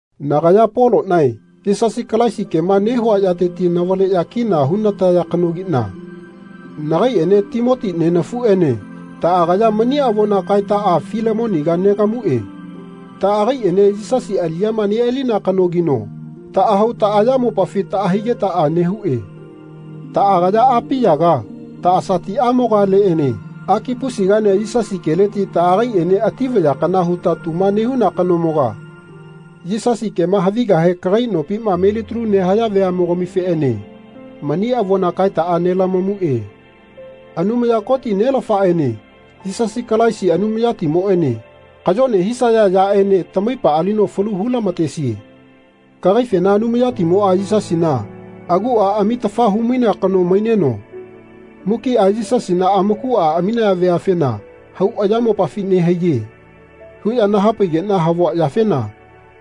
Nagaya Polonae Yisasi Kalaisi kema nehua yateti navaleya kina hunataya kanogina nagaiene Timoti nenafuene taagaya mani avona kaetaa Filemoniga nelamue taagaiene Yisasi aliyama nealina kanogino taahau taayamopafi laahaigetaa nehue. Taagaya Apiyaga taasatiamogaleene Akipusigaene Yisasi keleti taagaiene ati vaya kana huta tuma nehuna kanomoga Yisasi kema havigahe kagai nopima melitalu nehaya veamogamifeene mani avona kaetaa nelamamue. Anumaya Koti, Nelafaene Yisasi Kalaisi Anumayatimoene kayone hisaa yaene tamaipa alino falu hulamatesae. Kagaifena Anumayatimoa Yisasina agua amitafa humainea kano maineno mukia Yisasina amakua amiya veafena hau ayamopafi nehaiye. huya nahapaigena havua yafena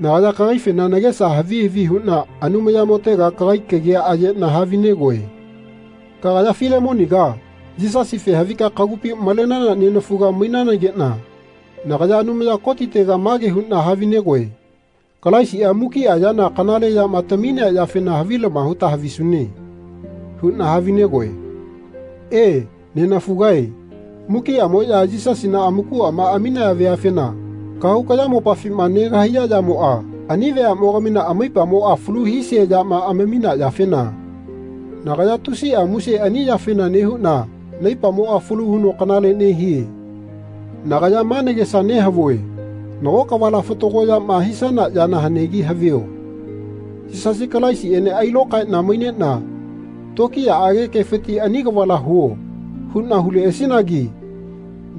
nagaya kagaifena nagesa havi havi huna Anumayamotega kagai kagia ayena havinegoe. Kagaya Filemoniga Yisasife havika kagupi malenana nenafuga mainanagena nagaya Anumaya Kotitega mage huna havinegoe Kalaisia mukia yana kanale yama taminea yafena havilama huta havisune. huna havinegoe. E, nenafugae mukiamoya Yisasina amakuama aminaya veafena kahau kayamopafima negahaiya yamoa ani veamogamina amaipamoa falu hisea yama amamina yafena nagaya tusia muse ani yafena nehuna naipamoa falu huno kanale nehie. Nagaya ma nagesa nehavue nago kavala fatago yama hisana yana hanegi havio. Yisasi Kalaisiene ailokaena mainena tokiyaage kefiti Ani kavala huo. huna huleasinagi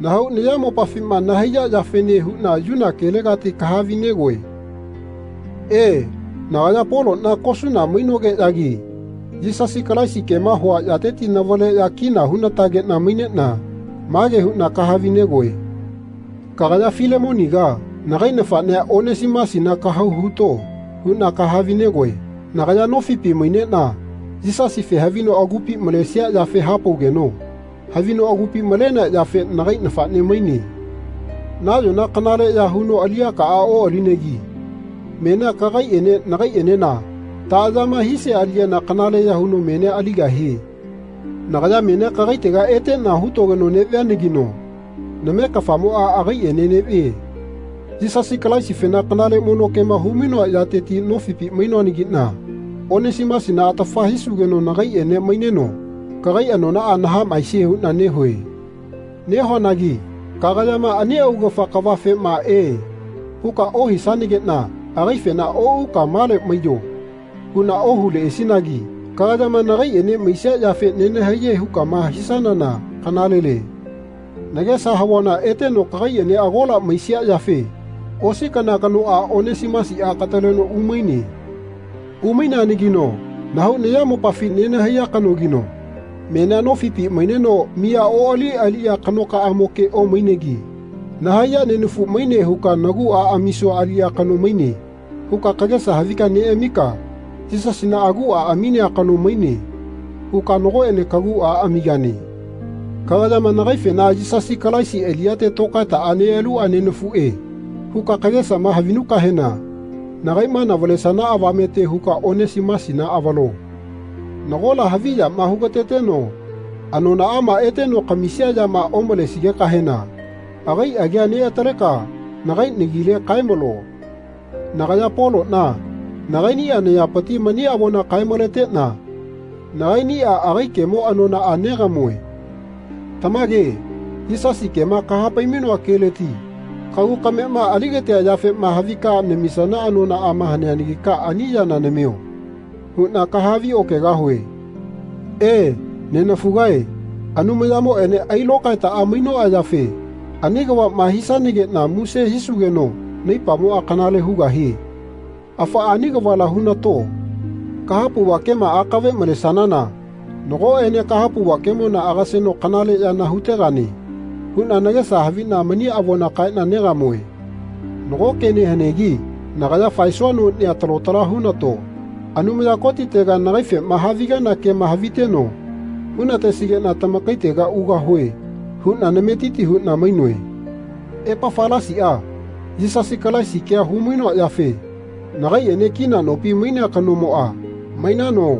nahau nayamopafima nahaiya yafene huna yuna kelegati kahavi-negoe. E, nagaya Polona kosuna mainogeyagi Yisasi Kalaisi kema hua yateti navaleya kina hunatagena mainena mage huna kahavi-negoe. Kagaya Filemoniga nagai nafanea Onesimusina Kahau huto. huna kahavi-negoe. Nagaya nofipi mainena Yisasife havino agupi malesia yafe hapaugeno havino agupi malenea yafe nagai nafane maine. Nayona kanaleya huno aliyakaa oalinegi menia kagaiene nagaienena taayama hisia aliyana kanaleya huno menia aligahie. Nagaya menia kagaitega etena hutogeno nevianagino name-kafamoa agaiene nevie. Yisasi Kalaisifena kanale mono kema humainoa yateti nofipi mainoanagina Onesimusina atafa hisugeno nagaiene maineno kagai anonaa nahamaesie huna nehue. Nehuanagi kagayama ani augafa kavafema E. huka ohisanagena agaifena Ouka male maiyo. huna ohuleasinagi kagayama nagaiene maisia yafe nenahaiye hukama hisanana kanalele. Nagesa havuana eteno kagaiene agola maisia yafe osi kana kanoa Onesimusia kataleno umaine. Umaineanagino nahau nayamopafi nenahaiya kanogino menia nofipi maineno miya oali aliya kanokaamoke omainegi Nahaiya nenafu maine huka nagua amisua aliya kano maine. huka kagesa havi neamika Yisasina agua aminea kano maine. huka nagoene kagua amigane. Kagayama nagaifena Yisasi Kalaisi aliyate tokaetaa nealua nenafue. huka kagesama havinukahena nagaima navalesana avamete huka Onesimusina avalo. Nagola havi yama hugateteno anonaama eteno kamisia yama omalesigekahena agai agia neataleka nagai nagile kaemalo. Nagaya Polona nagainia nayapiti mani avona kae-maletena nagainia agai kemo anonaa negamue. Tamage Yisasi kema kahapai-mainoa keleti kagu kamena aligatea yafema havika namisana anonaama haneanagika ani yana Namio. huna kahavi-okegahue. E, nenafugae Anumayamoene ailokaetaa mainoa yafe ani kavama hisanagena muse hisugeno naipamoa kanale hugahie. Afaa ani kavala hunato. Kahapauva kema akave malesanana nagoene kahapauva kemona agaseno kanale yana hutegane huna nagesa havina mani avona kaena negamue. Nago kene hanegi nagaya faesua nonia talo tala hunato. Anumaya Kotitega nagaifema havigana kema haviteno hunatesigena tamakaitega ugahue huna nametiti huna mainoe. Epafalasia Yisasi Kalaisi kea humainoa yafe nagaiene kina nopi mainea kanomoa Mainano?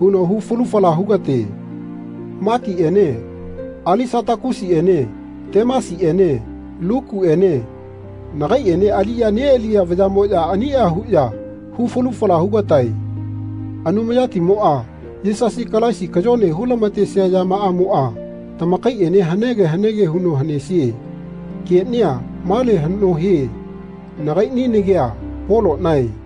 huno hu falu fala hugate. Makiene Alisatakusiene Temasiene Lukuene nagaiene aliya nealiya vayamoya ania huya hu falu fala hugatae. Anumayatimoa Yisasi Kalaisi kayone hulamatesia yamaamoa tamakaiene hanege hanege huno hanesie. Kenia male hano hie. Nagaini nagia Polonae.